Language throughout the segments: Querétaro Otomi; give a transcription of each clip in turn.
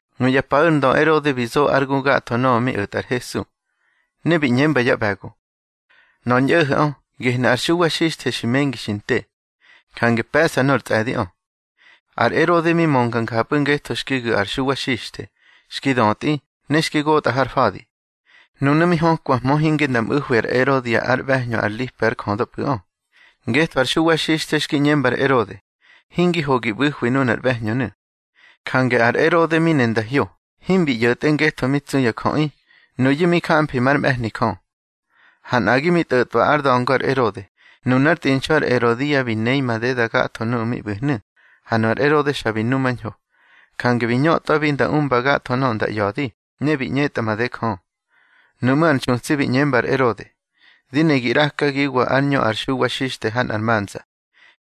Nuya paꞌu̱ ar ndö Erode bi zo ár gu gatho nöꞌö mi o̱tꞌa ar Hesu. Ne bi ꞌñemba yá ꞌbe̱go: —Nöꞌö ar ñꞌo̱ho̱ꞌö, gehni ar Xuwa Xixthe xi mengi xi nte, jange pe̱ꞌsa nor tsꞌe̱diꞌö. Ar Erode mi mönga njapꞌu̱ ngetho xki gu̱ ar Xuwa Xixthe, xki dötꞌi, ne xki gotꞌa har fa̱di. Nunu̱ mi hökwahmö hinge nda mꞌu̱hwi ar Erodia ár ꞌbe̱hñö ar Lipe ár jödöpꞌu̱ꞌö. Ngetho ar Xuwa Xixthe xki ꞌñemba ar Erode: —Hingi ho gi ꞌbu̱hwi nunar ꞌbe̱hñönu̱. Jange ar Erode mi ne nda hyo. Himbi ꞌyo̱tꞌe ngetho mi tsu ya jöꞌi, nuyu̱ mi jamfi már mꞌe̱hni Jö. Ha nꞌagi mi tꞌo̱tꞌwa ár da̱ngo ar Erode, nunár tꞌinxu ar Erodia bi nei madeda gatho nuꞌu̱ mi ꞌbu̱hnu̱, ha nu ar Erode xa bi numañho. Jange bi ñötꞌwabi nda umba gatho nöꞌö nda ꞌya̱di, ne bi ꞌñetꞌa made Jö. Nuꞌmú̱ ar nxutsi bi ꞌñemba ar Erode: —Di ne gi ꞌrakagiwa ár ñö ar Xuwa Xixthe ha nꞌar manza.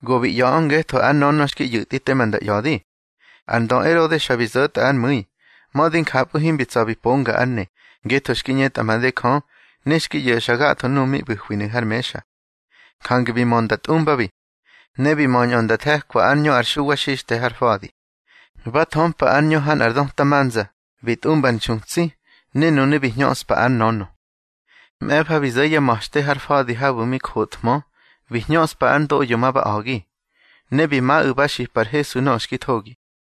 Go bi ꞌya̱ꞌö ngetho ár nönö xki ꞌyu̱tꞌi tema nda ꞌya̱di. Ar ndö Erode xa bi zo̱tꞌa ár mu̱i. Mödi njapꞌu̱ himbi tsa̱ bi ponga ár ne, ngetho xki ꞌñetꞌa made Jö, ne xki ꞌyo̱xa gatho nuꞌu̱ mi ꞌbu̱hwinu̱ har mexa. Jange bi mö nda tꞌumbabi. Ne bi möñꞌö nda the̱kwa ár ñö ar Xuwa Xixthe har fa̱di. Ba thömpa ár ñö ha nꞌar döta manza, bi tꞌumba ar nxutsi, ne nunu̱ bi hñöꞌspa ár nönö. Mꞌe̱fa bi zo̱ yá ma̱xte har fa̱di habu̱ mi jothmö, bi hñöꞌspa ár ndoꞌyo ma ba a̱gi, ne bi maꞌu̱ ba xipa ar Hesu nöꞌö xki thogi.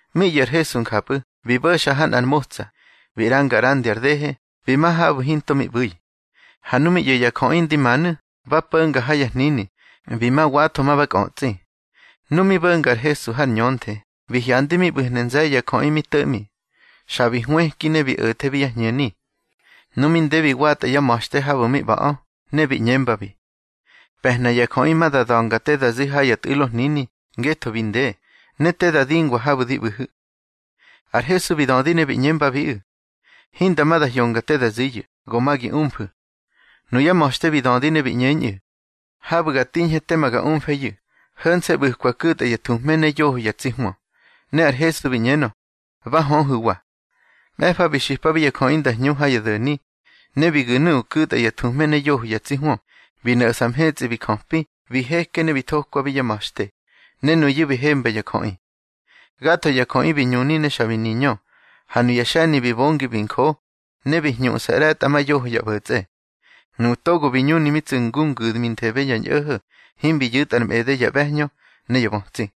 Mi ꞌyo̱ ar Hesu njapꞌu̱, bi bo̱xa ha nꞌar motsa, bi ꞌranga ꞌrandi ar dehe, bi ma habu̱ hinto mi ꞌbu̱i. Ha nu mi ꞌyo̱ ya jöꞌi ndi manu̱, ba po̱nga ha ya hnini, bi ma watho ma ba kꞌötsꞌi. Nu mi bo̱nga ar Hesu har ñönthe, bi hyandi mi ꞌbu̱hnu̱ nze̱ye̱ ya jöꞌi mi to̱ꞌmi. Xa bi hwëki ne bi o̱thebi yá hñeni. Nu mi nde bi watꞌa yá ma̱xte habu̱ mi ꞌba̱ꞌö, ne bi ꞌñembabi: —Pe̱hna ya jöꞌi ma da da̱nga te da zi ha ya tꞌu̱lo hnini, ngetho bi nde, ne te da dingwa habu̱ di ꞌbu̱hu̱. Ar Hesu bi dödi ne bi ꞌñembabiꞌu̱: —Hinda ma da hyonga te da ziyu̱, go ma gi umfu̱. Nuyá ma̱xte bi dödi ne bi ꞌñeñꞌu̱: —Habu̱ ga tiñhe tema ga umfeyu̱. Ho̱nse̱ ꞌbu̱kwa ku̱tꞌa ya thuhme ne yoho ya tsi hwö. Ne ar Hesu bi ꞌñenö: —Ba höhu̱wa. Mꞌe̱fa bi xipabi ya jöꞌi nda hñu ha ya do̱ni. Ne bi gu̱ nuꞌu̱ ku̱tꞌa ya thuhme ne yoho ya tsi hwö, bi no̱ꞌsa mhetsꞌi bi jöpi, bi heke ne bi thokwabi yá ma̱xte, ne nuyu̱ bi hemba ya jöꞌi. Gatho ya jöꞌi bi ñuni ne xa bi niñö, ha nuya xe̱ni bi bongi bi njo, ne bi ñhuꞌsa ꞌre̱tꞌamayoho ya ꞌbo̱tsꞌe. Nuꞌu̱ togo bi ñuni mi tsu̱ ngu ngu̱dminthebe ya ñꞌo̱ho̱, himbi yu̱tꞌa ar mꞌede ya ꞌbe̱hñö ne ya bötsi.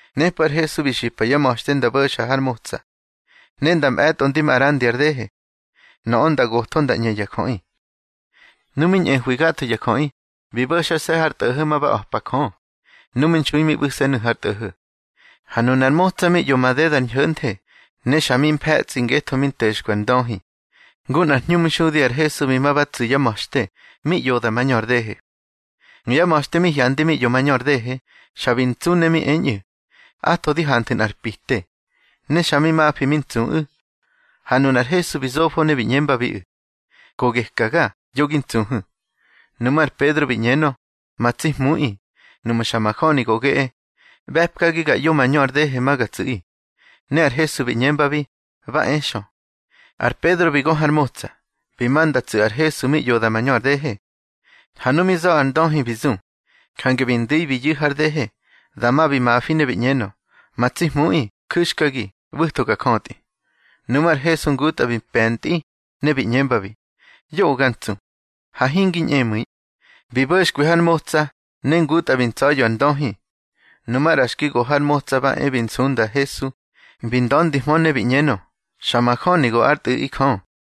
Nepꞌu̱ ar Hesu bi xipa yá ma̱xte nda bo̱xa har motsa, ne nda mꞌe̱tꞌo ndi ma ꞌrandi ar dehe. Nöꞌö nda gotho nda ꞌñe ya jöꞌi. Nu mi ñꞌehwi gatho ya jöꞌi, bi bo̱xase̱ har tꞌo̱ho̱ ma ba a̱pa Jö. Nu mi nxui mi ꞌbu̱se̱nu̱ har tꞌo̱ho̱. Ha nunar motsa mi ꞌyo madedar ñho̱nthe, ne xa mi mfe̱tsꞌi ngetho mi nto̱xkwi ar ndöhi. Ngu nꞌar hñumxudi ar Hesu bi ma ba tsu̱ yá ma̱xte, mi ꞌyoda mañö ar dehe. Nuyá ma̱xte mi hyandi mi ꞌyo mañö ar dehe, xa bi ntsu ne mi eñꞌu̱: —Atho di hanthu̱ nꞌar pite. Ne xa mi mafi mi ntsuꞌu̱. Ha nunar Hesu bi zofo ne bi ꞌñembabiꞌu̱: —Go gekaga, yo gi ntsuhu̱. Nuꞌmú̱ ar Pedro bi ꞌñenö: —Ma tsi Hmuꞌi, nuꞌmu̱ xa majöni go geꞌe, ꞌbe̱pkagi ga ꞌyo mañö ar dehe ma ga tsu̱ꞌi. Ne ar Hesu bi ꞌñembabi: —Ba e xö. Ar Pedro bi gö har motsa, bi ma nda tsu̱ ar Hesu mi ꞌyoda mañö ar dehe. Ha nu mi za̱ ar ndöhi bi zu, jange bi ndu̱i bi yu̱ har dehe. Dama bi mafi ne bi ꞌñenö: —Ma tsi Hmuꞌi, ju̱xkagi, ꞌbu̱tho ga jötꞌi. Nuꞌmú̱ ar Hesu ngutꞌa bi pe̱ntꞌi, ne bi ꞌñembabi: —Yoꞌö ga ntsu, ha hingi ñꞌemu̱i. Bi bo̱xkwi har motsa, ne ngutꞌa bi ntsa̱ya̱ ar ndöhi. Nu maꞌra xki go har motsa ba e bi nsunda ar Hesu, bi nda̱ndihmö ne bi ꞌñenö: —Xa majöni go ár Tꞌu̱ꞌi Jö.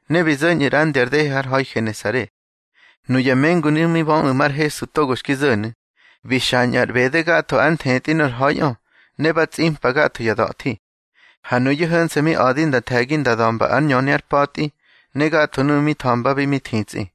Ne bi zo̱ñꞌu̱ ꞌrandi ar dehe har ha̱i Genesare. Nuya mengunu̱ mi böꞌu̱ mar Hesu togo xki zo̱nu̱, bi xañꞌu̱ ar ꞌbede gatho ár nthetꞌi nor ha̱iꞌö, ne ba tsꞌimpa gatho ya da̱thi. Ha nuyu̱ ho̱nse̱ mi a̱di nda the̱gi nda da̱mba ár ñöni ár pa̱tꞌi, ne gatho nuꞌu̱ mi tha̱mbabi mi thitsꞌi.